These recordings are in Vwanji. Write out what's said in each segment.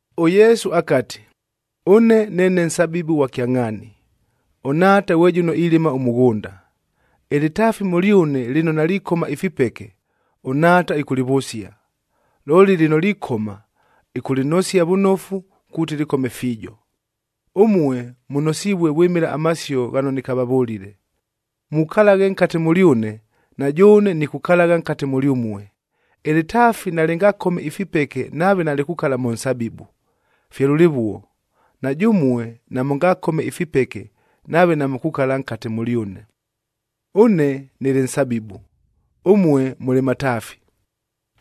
ɄYesu akati, “Ʉne neene nsabibu ghwa kyangʼhaani, ʉNhaata ghwe jʉno ilɨma ʉmʉghʉnda. Ɨlɨtaafi mʉlyʉne lɨno nalikoma ifipeke, ʉNhaata ɨkʉlɨvʉsia. Looli lɨno likoma, ɨkʉlɨnosia vʉnofu kuuti lɨkome fiijo. Ʉmue mʉnosivue vwɨmɨla amasio ghano nɨkavavʉlile. Mukalaghe nkate mʉlyʉne, na jʉʉne nikukalagha nkate mʉlyʉmue. Ɨlɨtaafi nalɨngakome ifipeke nave nalikukala mʉ nsabibu, fye lʉlɨvuo, na jʉmue namʉngakome ifipeke nave namukukala nkate mʉlyʉne. “Ʉne nɨlɨ nsabibu, ʉmue mʉlɨ mataafi.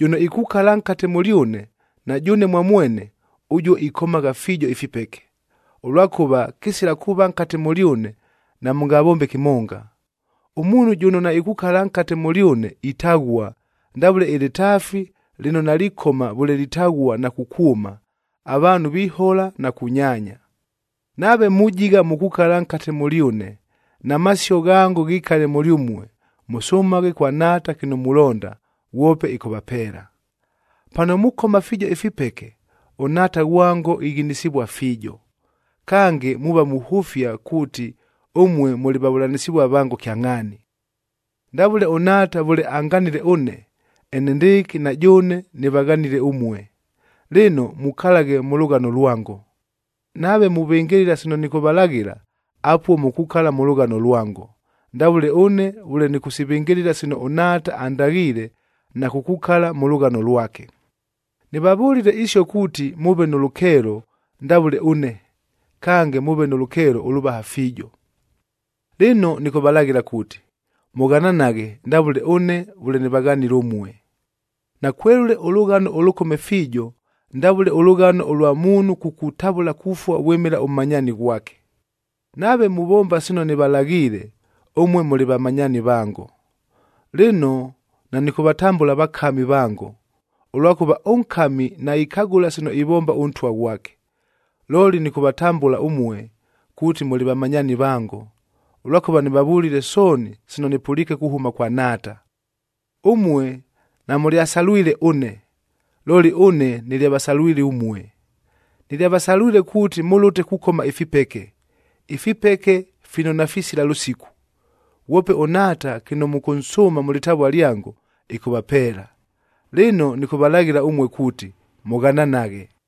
Jʉno ikukala nkate mʉlyʉne, na jʉʉne mwa mwene, ʉjuo ikomagha fiijo ifipeke, ʉlwakʉva kɨsila kuuva nkate mʉlyʉne, namʉngavombe kɨmonga. Ʉmuunhu jʉno naikukala nkate mʉlyʉne itaghua, ndavʉle ɨlɨtaafi lɨno nalikoma vʉle litaghua na kukwʉma, avaanhu vihola na kunyaanya. Nave mujigha mukukala nkate mʉlyʉne na masio ghango ghikale mʉlyʉmue, mʉsʉmaghe kwa Nhaata kɨno mulonda, ghwope ɨkʉvapeela. Pano mukoma fiijo ifipeke, ʉNhaata ghwango ighinisivua fiijo. Kange, muuva muhʉfia kuuti ʉmue mʉlɨ vavʉlanɨsɨvua vango kyangʼhaani. “Ndavʉle ʉNhaata vʉle anganile ʉne, enendɨɨkɨ na jʉʉne nɨvaghanile ʉmue. Lɨno, mukalaghe mʉ lʉghano lwango. Nave muvɨngɨlɨla sino nɨkʉvalaghɨla, apuo mukukala mʉ lʉghano lwango, ndavʉle ʉne vʉle nɨkʉsivɨngɨlɨla sino ʉNhaata andaghiile na kukukala mʉ lʉghano lwake. “Nɨvavʉlile isio kuuti mʉʉve nʉ lʉkeelo ndavʉle ʉne, kange mʉʉve nʉ lʉkeelo ʉlʉvaha fiijo. Lɨno nɨkʉvalaghɨla kuuti, mʉghananaghe ndavʉle ʉne vʉle nɨvaghanile ʉmue. Nakwelʉle ʉlʉghano ʉlʉkome fiijo, ndavʉle ʉlʉghano ʉlwa muunhu kukutavʉla kufua vwɨmɨla ʉmmanyaani ghwake. Nave muvomba sino nɨvalaghiile, ʉmue mʉlɨ vamanyaani vango. Lɨno, nanɨkʉvatambʉla vakami vango, ʉlwakʉva ʉnkami naikagʉla sino ivomba ʉntwa ghwake. Looli nɨkʉvatambʉla ʉmue kuuti mʉlɨ vamanyaani vango, ʉlwakʉva nɨvavʉlile sooni sino nɨpʉliike kuhʉma kwa Nhaata. Ʉmue namʉlyasalwile ʉne, looli ʉne nɨlyavasalwile ʉmue. Nɨlyavasalwile kuuti mʉlʉte kukoma ifipeke, ifipeke fino nafisila lʉsiku. Ghwope ʉNhaata kɨno mʉkʉnsʉʉma mʉ lɨtavua lyango, ɨkʉvapeela. Lɨno nɨkʉvalaghɨla ʉmue kuuti, mʉghananaghe.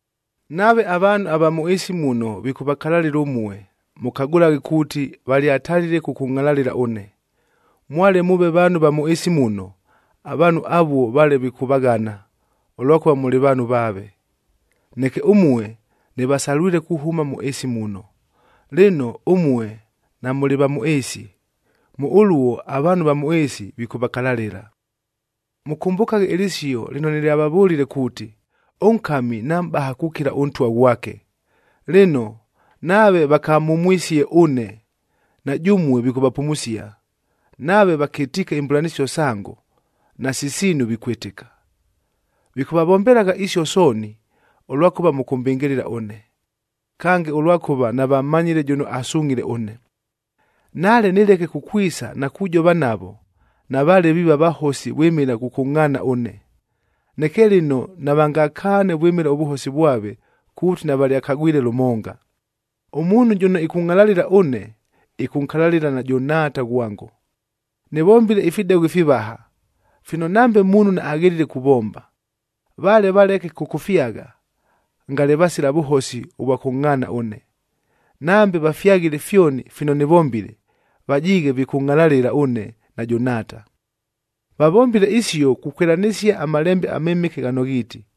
“Nave avaanhu ava mʉ ɨɨsi muno, vikʉvakalalɨla ʉmue, mʉkagʉlaghe kuuti valyatalile kʉkʉngʼhalalɨla ʉne. Mwale mʉʉve vaanhu va mʉ ɨɨsi muno, avaanhu avuo vale vikʉvaghana, ʉlwakʉva mʉlɨ vaanhu vaave. Neke ʉmue nɨvasalwile kuhʉma mʉ ɨɨsi muno, lɨno ʉmue namʉlɨ va mʉ ɨɨsi. Mʉ ʉluo avaanhu ava mʉ ɨɨsi vikʉvakalalɨla. Mʉkʉmbʉkaghe ɨlɨsio lɨno nɨlyavavʉlile kuuti, ‘Ʉnkami namʼbaha kukila ʉntwa ghwake.’ Lɨno, nave vakamhumwisie ʉne, na jʉmue vikʉvapumusia. Nave vakɨtiike imbʉlanɨsio sango, nasi siinu vikwɨtɨka. Vikʉvavombelagha isio sooni, ʉlwakʉva mʉkʉmbɨngɨlɨla ʉne, kange ʉlwakʉva navammanyile jʉno asungʼhile ʉne. Nale nɨleke kukwisa na kujova navo, navaale viiva vahosi vwɨmɨla kʉkʉngʼhaana ʉne. Neke lɨno navangakaane vwɨmɨla ʉvʉhosi vwave kuuti navalyakagwile lʉmonga. “Ʉmuunhu jʉno ɨkʉngʼhalalɨla ʉne, ɨkʉnkalalɨla najʉ Nhaata ghwango. Nɨvombile ifidegho ifivaha, fino nambe muunhu naaghelile kuvomba. Vale valeke kʉkʉfyagha, ngale vasila vʉhosi ʉvwa kʉngʼhaana ʉne. Nambe vafyaghile fyoni fino nɨvombile, vajiighe vikʉngʼhalalɨla ʉne najʉ Nhaata. Vavombile isio, kukwɨlanɨsia aMalembe aMɨmɨke ghano ghiiti,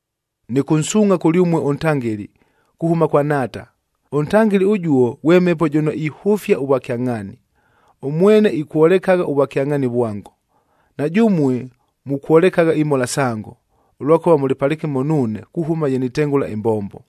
“Nɨkʉnsuungʼha kʉlyʉmue ʉNtangɨli kuhʉma kwa Nhaata. ɄNtangɨli ʉjuo ghwe Mhepo jʉno ihʉfia ʉvwakyangʼhaani, ʉmwene ikwolekagha ʉvwakyangʼhaani vwango. Na jʉmue mukwolekagha imhola sango, ʉlwakʉva mʉlɨ palɨkɨmo nuune kuhʉma ye nitengʉla ɨmbombo.